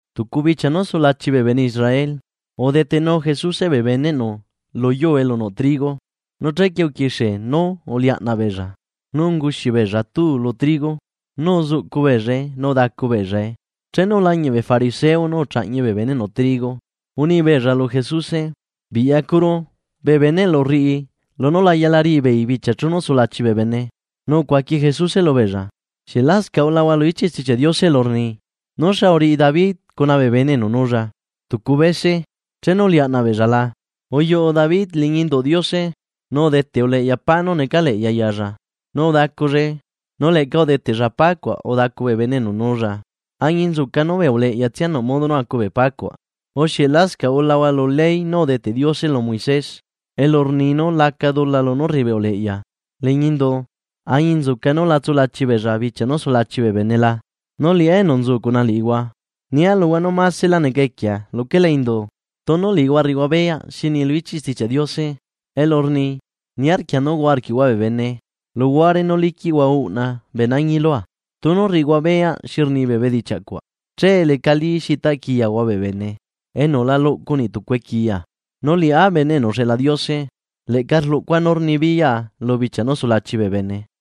Tucu bichia nú sulachi bee bene Israel, udetenu Jesuse bee beneꞌnu lu yuu elu nuꞌ trigo, nu chequie uquixie nú uliaꞌnaꞌ beella nu unguxi beella tuu lu trigo nu uzuꞌcu beellae nu udacu beellae. Chenu ulañiꞌ bee fariseo nú uchaꞌñi bee beneꞌnu trigo, uni beella lu Jesuse: ―Biꞌyacuru, bee beneꞌlu rriꞌi lunú la yala riꞌi beei bichia nú sulachi bee bene. Nu ucuaqui Jesuse lubeella: ―¿Xieꞌ lascaꞌ ulahua lu ichiꞌ Stichiaꞌ Diose elu rni nú xa uriꞌi David cuna bee bene enu nulla tucu bese chenu uliaꞌnaꞌ beella la? Uyuꞌu David liñi induꞌ Diose nu udeteꞌ uleꞌya pá nú necaleꞌya yalla nu udacullae nu leꞌca udeteꞌlla pá cuaꞌ udacu bee bene enu nuulla añinzuca nú bee uleꞌyatsia nuꞌ modo nú acu bee pá cuaꞌ. ¿Urre xieꞌ lascaꞌ ulahua lu ley nú udeteꞌ Diose lu Moisés elu rni nú laca dula lunú rriꞌi bee uleꞌya liñi indu añinzuca núla tsulachi beella bichia nú sulachi bee bene la? Nu liꞌá enu nzu cuna liꞌihua, nia luhua nú masela neca equiea luquela indu. Tunu liꞌihua rriꞌihua beyaꞌ xi rni lu ichiꞌ Stichiaꞌ Diose elu rni: “Niarquia nú huaꞌa arquiꞌhua bee bene luhuare nú liquiꞌhua uꞌna bee nañi lua.” Tunu rriꞌihua beyaꞌ xi rni bee bedichiaꞌ cuaꞌ che lecalí xi taꞌquiyahua bee bene enu la luꞌcu niꞌ tucu equiya. Nu liꞌá Bene enu uxeꞌla Diose leꞌca rluꞌcua nú rnibiyaꞌa lu bichia nú sulachi bee bene.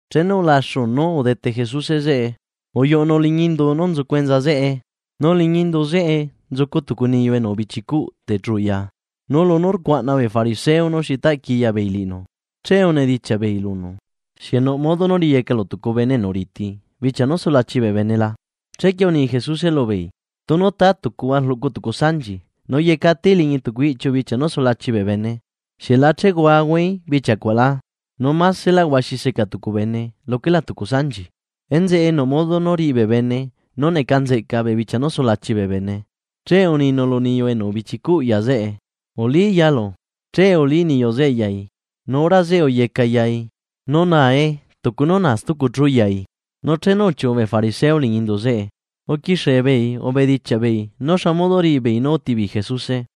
Chenu ulaxu nú udete Jesuse zeꞌe uyuꞌunu liñi indu nú nzucu enza zeꞌe. Nu liñi indu zeꞌe nzucu tucu niyu enu ubichicuꞌ techu ya, nu lunú rcuaꞌna bee fariseo nuxi taꞌquiya beei liꞌinu che unedichiaꞌ beei lunu: ―¿Xieꞌ nuꞌ modo nú riyecalu tucu bene enu riti bichia nú sulachi bee bene la? Chequie uni Jesuse lubeei: ―Tunu tatucuhua rluꞌcu tucu sanchi nu yecataí liñi tucu iꞌchiu bichia nú sulachi bee bene, ¿xieꞌ la chehuahuaí bichia cuaꞌ la? Nu ¡masela huaxi seca tucu bene luquela tucu sanchi! Enzeꞌe nuꞌ modo nú riꞌi bee bene nú neca nzeꞌca bee bichia nú sulachi bee bene. Che uninu lu niyu enu ubichicuꞌ ya zeꞌe: ―Ulí yalu. Che ulí niyu zeꞌe yai nu hora zeꞌe uyecaꞌ yai, nu nae tucu nú naa stucu chu yai. Nu chenu uchiuꞌu bee fariseo liñi indu zeꞌe, uquixie beei ubedichiaꞌ beei nú xa modo riꞌi beei para nú uti beei Jesuse.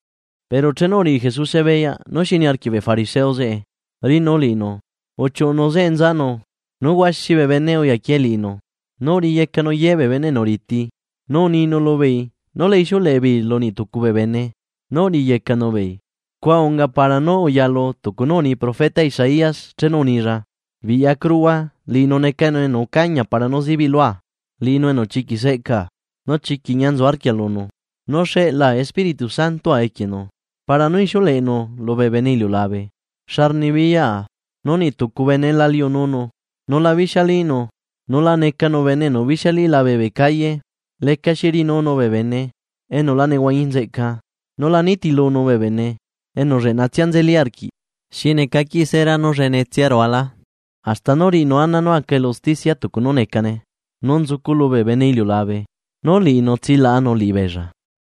Pero chenu uriꞌi Jesuse beyaꞌ nuxi niarquiꞌ bee fariseo zeꞌe riꞌinu liꞌinu uchiuꞌunu zeꞌe nzanu, nu huaxi bee bene uyaquie liꞌinu, nu uriyecanu ye bee bene enu riti, nu uninu lubeei nu la ixiuleꞌe beei lu niꞌ tucu bee bene nú uriyecanu beei. Scua unga para nú uyalu tucu nú uni profeta Isaías chenu unilla: ―Biꞌyacuruhua liꞌinu necanu enu ucañia para nú zibiꞌ lua, Liꞌinu enu chiquiꞌ seꞌcaa, nu chiquiꞌ ñia nzu arquia lunu. Nu xeꞌla Espíritu Santoa equienu, para nú ixiuleꞌenu lubee bene iliulabe xa rnibiyaꞌa. Nu niꞌ tucu bene la liununu, nula bixialínu, nu la necanu bene enu bixialí labe bee calle. Lecaxi riꞌinunu bee bene enu la nehuañi nzeꞌca, nu la nitilunu bee bene enu lleꞌnatsia nzeli arquiꞌ xi neca qui sera nú llenetsia rululá. Hasta nú riꞌinu ana nú aca elu usticia tucu nú necane. Nu nzuculu bee bene iliulabe nú liꞌinu tsilaꞌanu liꞌibeella.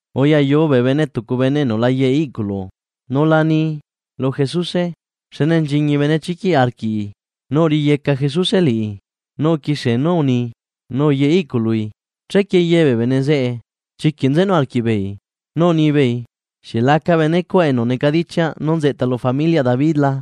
Uyayu bee bene tucu bene enu la yeꞌe iꞌculu nu la ni lu Jesuse, xne nchiñi benechiquiꞌ arquiꞌi. Nu uriyeca Jesuse liꞌi nu uquixie nú uni nu uyeꞌe iꞌcului. Chequie ye bee bene zeꞌe chiquiꞌ nzenu arquiꞌbeei nú unibeei: ―¿Xieꞌ laca benecuaꞌ enu necadichiaꞌ nú nzeꞌta lu familiaꞌ David la?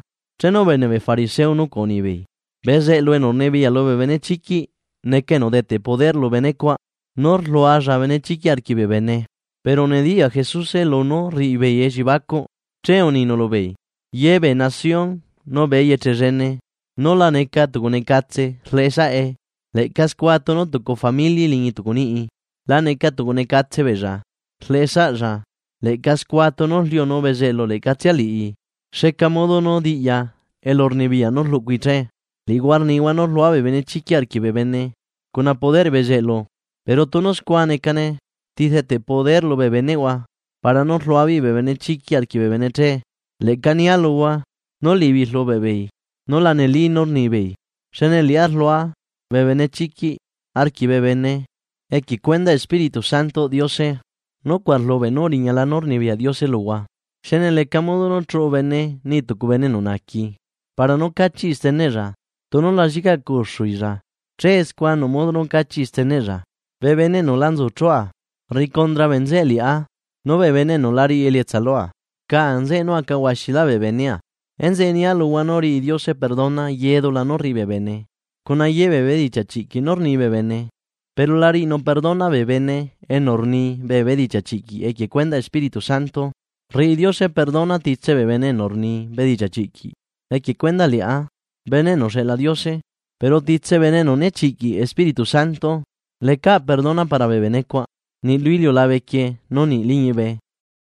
Chenu ubeneꞌ bee fariseo nucuaꞌ unibeei: ―Bezeꞌlu enu rnibiyaꞌ lubee benechiquiꞌ neca enu udeteꞌ poder lu bene cuaꞌ nú rlualla benechiquiꞌ arquiꞌ bee bene. Pero nediyaꞌ Jesuse lunú rriꞌi beei elliebacuꞌ, che uninu lubeei: ―Ye bee nación nu bee eyeche llene nú la neca tucunecatse rleꞌesaꞌe, leꞌca scua tunu tucu famili liñi tucu niꞌi laneca tucu necatse beella rleꞌe saꞌlla. Leꞌca scua tunu rliunu bezeꞌlu leꞌcatsia liꞌi. ¿Xneca modo nú diꞌya elurnibiyaꞌ nú rluꞌcui che? Liꞌihua rnihua nú rluaa bee benechiquiꞌ arquiꞌ bee bene cuna poder bezeꞌlu. Pero tunu scua necane, ¿ti rdeteꞌ poder lubee beneꞌhua para nú rlua beei bee benechiquiꞌ arquiꞌ bee bene che?, leꞌca nia luhua nú liꞌibeei rlubeꞌ beei nú la neli nú rnihua. Xne liꞌá rlua bee benechiquiꞌ arquiꞌ bee bene equie cuendaꞌ Espíritu Santoꞌ Diose, nucuaꞌ rlubeꞌ nú uriñala nú rnibiyaꞌ Diose luhua. ’Xne leca modo nú chuꞌu bene niꞌi tucu bene enu naaqui para nú cachiꞌi steneꞌlla, tunu la llicaꞌ cuxuilla. Che scua nuꞌ modo nú cachiꞌi steneꞌlla. ’Bee bene enu la nzu chua, rriꞌi cundra bee nzeꞌe liꞌá, nu bee bene enu la riꞌi elietsa lua, rca nzeꞌe nú aca huaxilá bee benea. ’Enzeꞌe nia luhua nú riꞌi Diose perdona ye dula nú rriꞌi bee bene cuna ye bee bedichiaꞌ chiꞌquiꞌ nú rni bee bene. Pero la riꞌinu perdona bee bene enu rni bee bedichiaꞌ chiꞌquiꞌ equie cuendaꞌ Espiritu Santo. Rriꞌi Diose perdona titse bee bene enu rni bedichiaꞌ chiꞌquiꞌ equie cuendaꞌ liꞌá, Bene enu uxeꞌla Diose, pero titse bene enu nechiꞌquiꞌ Espíritu Santo lecaꞌ perdona para bee benecuaꞌ niꞌ lu iliulabe quieꞌ nu niꞌ liñibe.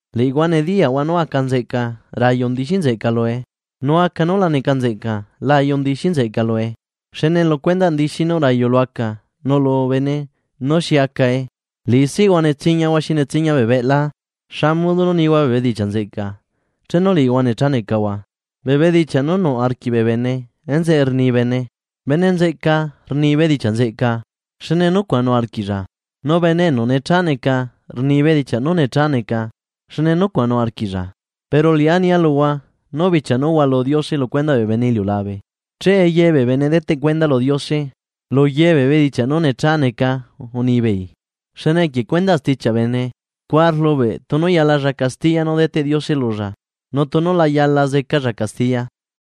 ’Liꞌihua nediyaꞌhua nú aca nzeꞌca rayu ndixi nzeꞌca lue, nu aca nú la neca nzeꞌca la ayu ndixí nzeꞌca lue, xne lu cuendaꞌ ndixí nú rayu lu aca nuꞌlu bene nú xi acae. ¡Liꞌisiꞌhua netsiñahua xi netsiña bee beꞌla! ¿Xa modo nú nihua bee bedichiaꞌ nzeꞌca chenu liꞌihua necha necahua? Bee bedichiaꞌ nú nuꞌ arquiꞌ bee bene enzeꞌe rni bene. Bene nzeꞌca rni bedichiaꞌ nzeꞌca, xne nucuaꞌ nuꞌ arquiꞌlla. Nu bene enu necha neca rni bee bedichiaꞌ nú necha neca xne nucuaꞌ nuꞌ arquiꞌlla. Pero liꞌá nia luhua nú bichia nú hualu Diose lu cuendaꞌ bee bene iliulabe, che ye bee bene deteꞌ cuenda lu Diose luye bee bedichiaꞌ nú necha neca unibeei. Xne equie cuendaꞌ stichiaꞌ bene, scua rlubeꞌ tunu yala nú zecalla castiya nú deteꞌ Diose lulla, nu tunu la yala zecalla castiya.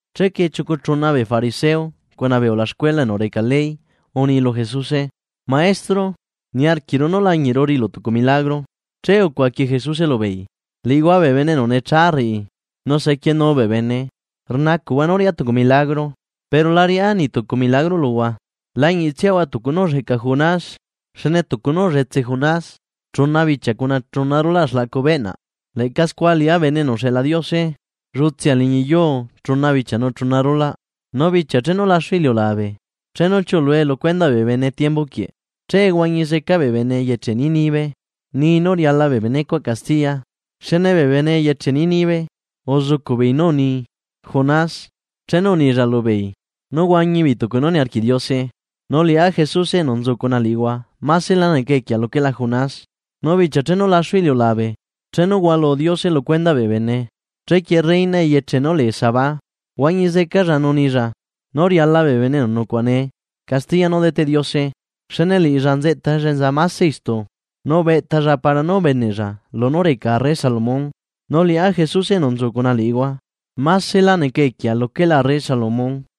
Chequie chiucu chuna bee fariseo cuna bee ulaxcuela enu reca ley uni lu Jesuse: ―Maestro, niarquiꞌru nú lañiꞌru riꞌilu tucu milagro. Che ucuaqui Jesuse lubeei: ―Liꞌihua bee bene enu necha rriꞌi nu sequienu bee bene rnacuꞌhua nú riaꞌa tucu milagro, pero la riꞌá niꞌtucu milagro luhua, lañiꞌtsiahua tucu nú ulleꞌca Jonás. Xne tucu nú ullutse Jonás chuna bichia cuna chuna rulaꞌ xlaꞌcu beꞌnaꞌ, leꞌca scua liꞌá Bene enu uxeꞌla Diose llutsea liñi yuu chuna bichia nu chuna rulaꞌ. Nu bichia chenu laxu iliulabe chenu chiuꞌlue lu cuendaꞌ bee bene tiembu quieꞌ, che huañi zeca bee bene eyeche Nínive ni nú riala bee bene cuaꞌ castiya xne bee bene eyeche Nínive uzucuꞌbeei nú uni Jonas chenu unilla lubeei nú huañi beei tucu nú niarquiꞌ Diose. Nu liꞌá Jesuse enu nzu cuna liꞌihua maselá neca equiea luquela Jonás. Nu bichia chenu laxu iliulabe, chenu hualu Diose lucuendaꞌ bee bene, chequie reina eyeche nú lee Sabá huañi zecalla nu nilla nú riala bee bene enu nucuaꞌa nee castiya nú deteꞌ Diose. Xne liꞌilla nzeꞌtalla enza mase istu, nu ubeꞌtalla para nú ubeneꞌlla lunú reca arre Salomón, nu liꞌá Jesuse enu nzu cuna liꞌihua, másela neca equiea luquela arre Salomón.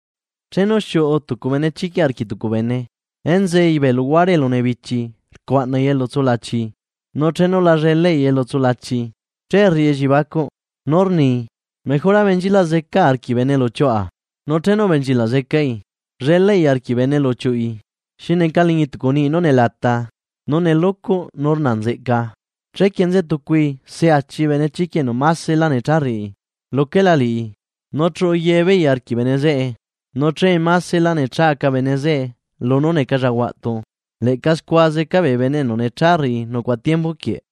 ’Chenu xiuꞌu tucu benechiquiꞌ arquiꞌ tucu bene, enzei bee luguare elu nebichi rcuaꞌnai elu tsulachii, nu chenu la llelaꞌi elu tsulachii, che rriꞌi elliebacuꞌ: Nú rni: “Mejora benchilaꞌ zecaa arquiꞌ bene elu uchiuꞌa.” Nu chenu ubenchilaꞌ zecai llelaꞌi arquiꞌ bene elu uchiuꞌi xi neca liñi tucu niꞌi nú nelata, nu nelucuꞌ nu rna nzeꞌca. Chequie nzetucui se achi benechiquiꞌ enu maselá necha rriꞌi luquela liꞌi, nu chuꞌu ye beei arquiꞌ bene zeꞌe, nu che masescaꞌlá necha aca bene zeꞌe lunú necalla huaꞌtu. Leꞌca scua zeca bee bene enu necha rriꞌi nucuaꞌa tiembu quieꞌ.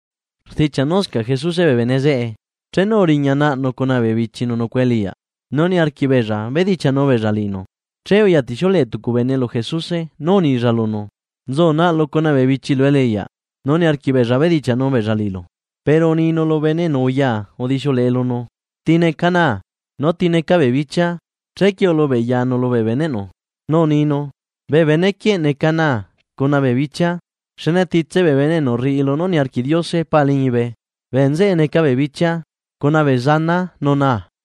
Rdichiaꞌ nuscaꞌ Jesuse bee bene zeꞌe, chenu uriña naꞌnu cuna bee bichinu nucuaꞌa eliꞌyaꞌ nu niarquiꞌ beella bedichiaꞌnu beella liꞌinu. Nu lunú nucuaꞌa beella eliꞌyaꞌ, che uyatixiuleꞌe tucu bene lu Jesuse nú unilla lunu: ―Nzu naꞌlu cuna bee bichilu eliꞌyaꞌ nu niarquiꞌ beella bedichiaꞌnu beella liꞌilu. Pero uninu lu bene enu uya udixiuleꞌe lunu: ―¿Ti neca naa, nu ti neca bee bichia? Chequie ulubeꞌyanu lubee beneꞌnu, nú uninu: ―Bee benequieꞌ neca naa cuna bee bichia. Xne titse bee bene enu rriꞌi lunú niarquiꞌ Diose Pa liñibe, bee nzeꞌe neca bee bichia, cuna bee zanaa nu naa.